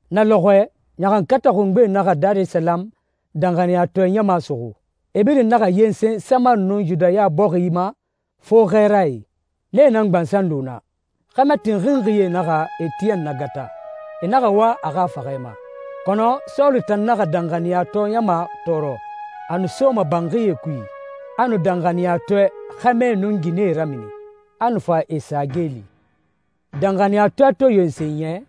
Na lɔxɔɛ, ɲaxankatɛ xungbe naxa Darisalamu danxaniyatɔɛ ɲama suxu. E birin naxa yensen Samari nun Yudaya bɔxi ma fo xɛɛrae, nee nan gbansan lu naa. Xɛmɛ tinxinxie naxa Etiyɛn nagata. E naxa wa a xa faxɛ ma. Kɔnɔ Sɔlu tan naxa danxaniyatɔɛ ɲama tɔɔrɔ. A nu soma banxie kui, a nu danxaniyatɔɛ xɛmɛe nun ginɛe ramini, a nu fa e sa geeli. Danxaniyatɔɛ to yensen yɛ,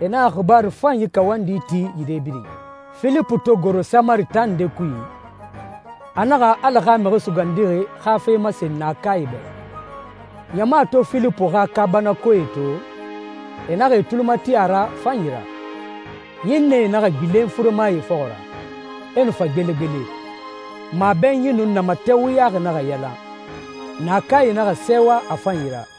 e naxa xibaaru fanyi kawandi ti yire birin. Filipu to goro Samari taa nde kui, a naxa Ala xa Mixi Sugandixi xa fe masen naakae bɛ. Ɲama to Filipu xa kaabanakoee to, e naxa e tuli mati a ra a fanyi ra. Ɲinnɛe naxa gbilen furemae fɔxɔ ra, e nu fa gbelegbele. Mabɛnyi nun namatɛ wuyaxi naxa yalan. Naakae naxa sɛɛwa a fanyi ra.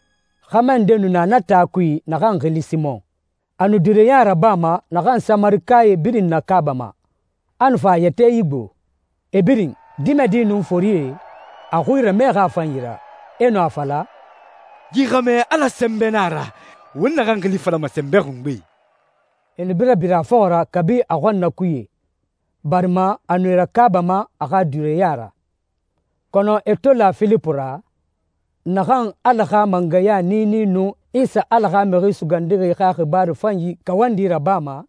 Xɛmɛ nde nu na na taa kui naxan xili Simɔn. A nu duureya rabama naxan Samarikae birin nakaabama, a nu fa a yɛtɛ igbo. E birin, dimɛdie nun forie, a xui ramɛxi a fanyi ra. E nu a fala, «Yi xɛmɛ Ala sɛnbɛ na a ra, won naxan xili falama Sɛnbɛ Xungbe.» E nu bara bira a fɔxɔ ra kabi a xɔnnakuye barima a nu e rakaabama a xa duureya ra. Kɔnɔ e to la Filipu ra, naxan Ala xa mangɛya niini nun Isa Ala xa Mixi Sugandixi xa xibaaru fanyi kawandi rabama,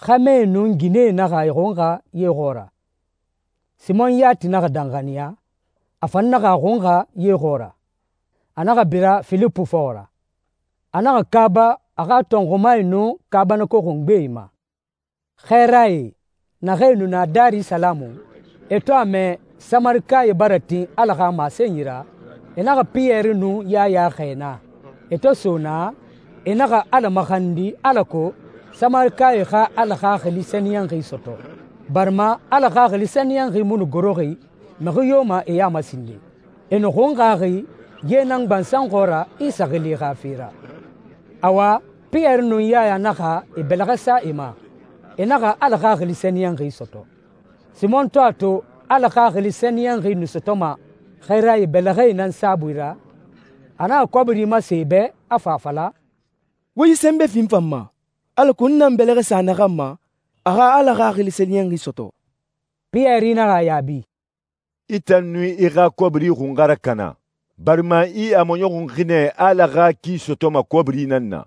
xɛmɛe nun ginɛe naxa e xunxa ye xɔɔra. Simɔn yati naxa danxaniya, a fan naxa a xunxa ye xɔɔra. A naxa bira Filipu fɔxɔ ra. A naxa kaaba a xa tɔnxumae nun kaabanako xungbee ma. Xɛɛrae, naxee nu na Darisalamu, e to a mɛ Samarikae bara tin Ala xa masenyi ra, e naxa Piyɛri nun Yaya xɛɛ naa. E to so naa, e naxa Ala maxandi alako Samarikae xa Ala Xaxili Sɛniyɛnxi sɔtɔ, barima Ala Xaxili Sɛniyɛnxi mu nu goroxi mixi yo ma e ya ma sinden. E nu xunxaxi ye nan gbansan xɔɔra Isa xili xa fe ra. Awa, Piyɛri nun Yaya naxa e bɛlɛxɛ sa e ma, e naxa Ala Xaxili Sɛniyɛnxi sɔtɔ. Simɔn to a to Ala Xaxili Sɛniyɛnxi nu sɔtɔma xɛɛrae bɛlɛxɛe nan saabui ra, a naxa kɔbiri masen e bɛ, a fa a fala, «Wo yi sɛnbɛ fi n fan ma, alako n na n bɛlɛxɛe sa naxan ma, a xa Ala Xaxili Sɛniyɛnxi sɔtɔ.» Piyɛri naxa a yaabi, «I tan nun i xa kɔbiri xun xa rakana, barima i a maɲɔxunxi nɛ Ala xa ki sɔtɔma kɔbiri nan na.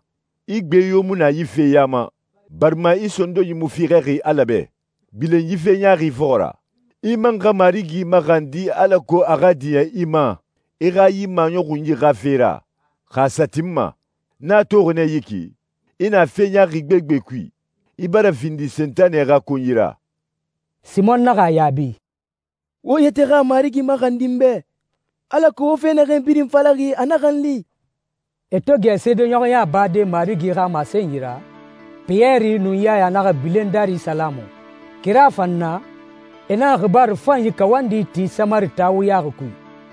I gbe yo mu na yi fe ya ma, barima i sondonyi mu fiixɛxi Ala bɛ. Gbilen yi fe ɲaaxi fɔxɔ ra. I man xa Marigi maxandi alako a xa diɲɛ i ma i xa yi maɲɔxunyi xa fe ra, xa a sa tinma. N a toxi nɛ yi ki, i na fe ɲaaxi gbegbe kui. I bara findi Sentanɛ xa konyi ra.» Simɔn naxa a yaabi, «Wo yɛtɛ xa Marigi maxandi n bɛ alako wo fe naxee birin falaxi a naxa n li.» E to gɛ seedeɲɔxɔya bade Marigi xa masenyi ra, Piyɛri nun Yaya naxa gbilen Darisalamu. Kira fan na, e naxa xibaaru fanyi kawandi ti Samari taa wuyaxi kui.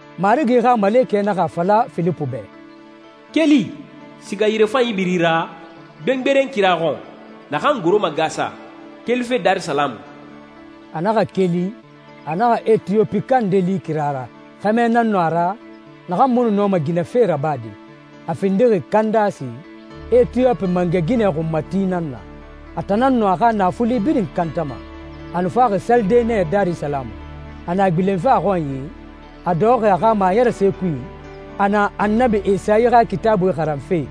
Marigi xa malekɛ naxa a fala Filipu bɛ, «Keli, siga yirefanyi biri ra, gbengberen kira xɔn, naxan goroma Gasa, kelife Darisalamu.» A naxa keli, a naxa Etiyopika nde li kira ra. Xɛmɛ nan nu a ra naxan mu nu nɔma ginɛ fe rabade. A findixi Kandasi, Etiyopi mangɛ ginɛ xunmati nan na. A tan nan nu a xa naafuli birin kantama. A nu faxi salide nɛ Darisalamu. A na gbilenfe a xɔnyi, a dɔxɔxi a xa maɲɛrɛse kui, a na Annabi Esayi xa Kitaabui xaranfe.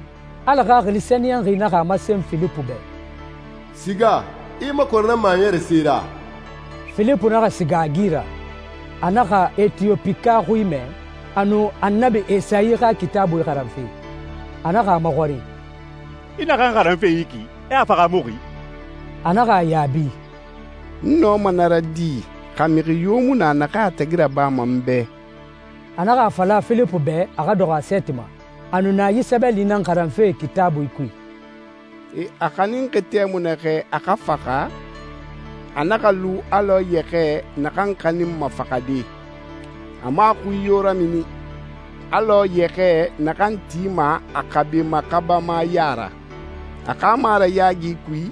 Ala Xaxili Sɛniyɛnxi naxa a masen Filipu bɛ, «Siga, i i makɔrɛ na maɲɛrɛse ra.» Filipu naxa siga a gi ra. A naxa Etiyopika xui mɛ, a nu Annabi Esayi xa Kitaabui xaranfe. A naxa a maxɔrin, «I naxan xaranfe yi ki, i a fahaamuxi?» A naxa a yaabi, «N nɔma na ra di, xa mixi yo mu na naxan a tagi rabama n bɛ?» A naxa a fala Filipu bɛ a xa dɔxɔ a sɛɛti ma. A nu na yi sɛbɛli nan xaranfe Kitaabui kui: «E a xaninxi tɛmui naxɛ a xa faxa a naxa lu alɔ yɛxɛɛ naxan xaninma faxade. A mu a xui yo ramini, alɔ yɛxɛɛ naxan tima a xabe maxabama ya ra. A xa marayaagi kui,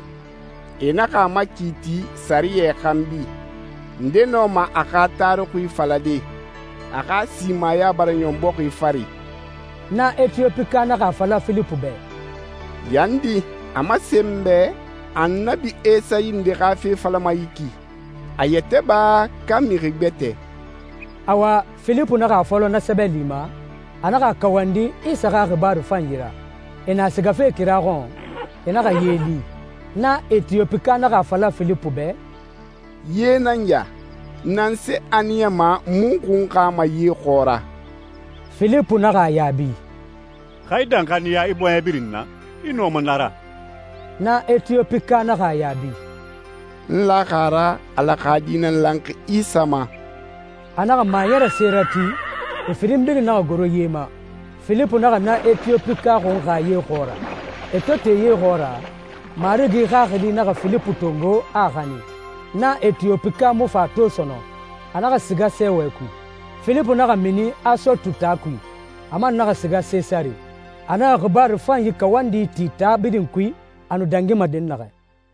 e naxa a makiiti sɛriyɛ xanbi. Nde nɔma a xa taruxui falade? A xa simaya bara ɲɔn bɔxi fari.» Na Etiyopika naxa a fala Filipu bɛ, «Yandi, a masen n bɛ, Annabi Esayi nde xa fe falama yi ki? A yɛtɛ ba, ka mixi gbɛtɛ?» Awa, Filipu naxa a fɔlɔ na sɛbɛli ma, a naxa a kawandi Isa xa xibaaru fanyi ra. E na sigafe kira xɔn, e naxa ye li. Na Etiyopika naxa a fala Filipu bɛ, «Ye nan ya. Nanse a niyama n mu xunxama ye xɔɔra?» Filipu naxa a yaabi, «Xa i danxaniya i bɔɲɛ birin na, i nɔma na ra.» Na Etiyopika naxa a yaabi, «N laxi a ra, Ala xa Di nan lanxi Isa ma.» A naxa maɲɛrɛse rati, e firin birin naxa goro ye ma. Filipu naxa na Etiyopika xunxa ye xɔɔra. E to te ye xɔɔra, Marigi Xaxili naxa Filipu tongo, a a xanin. Na Etiyopika mu fa a to sɔnɔn. A naxa siga sɛɛwɛ kui. Filipu naxa mini Asotu taa kui. A man naxa siga Sesare. A naxa xibaaru fanyi kawandi ti taa birin kui a nu dangima dɛnnaxɛ.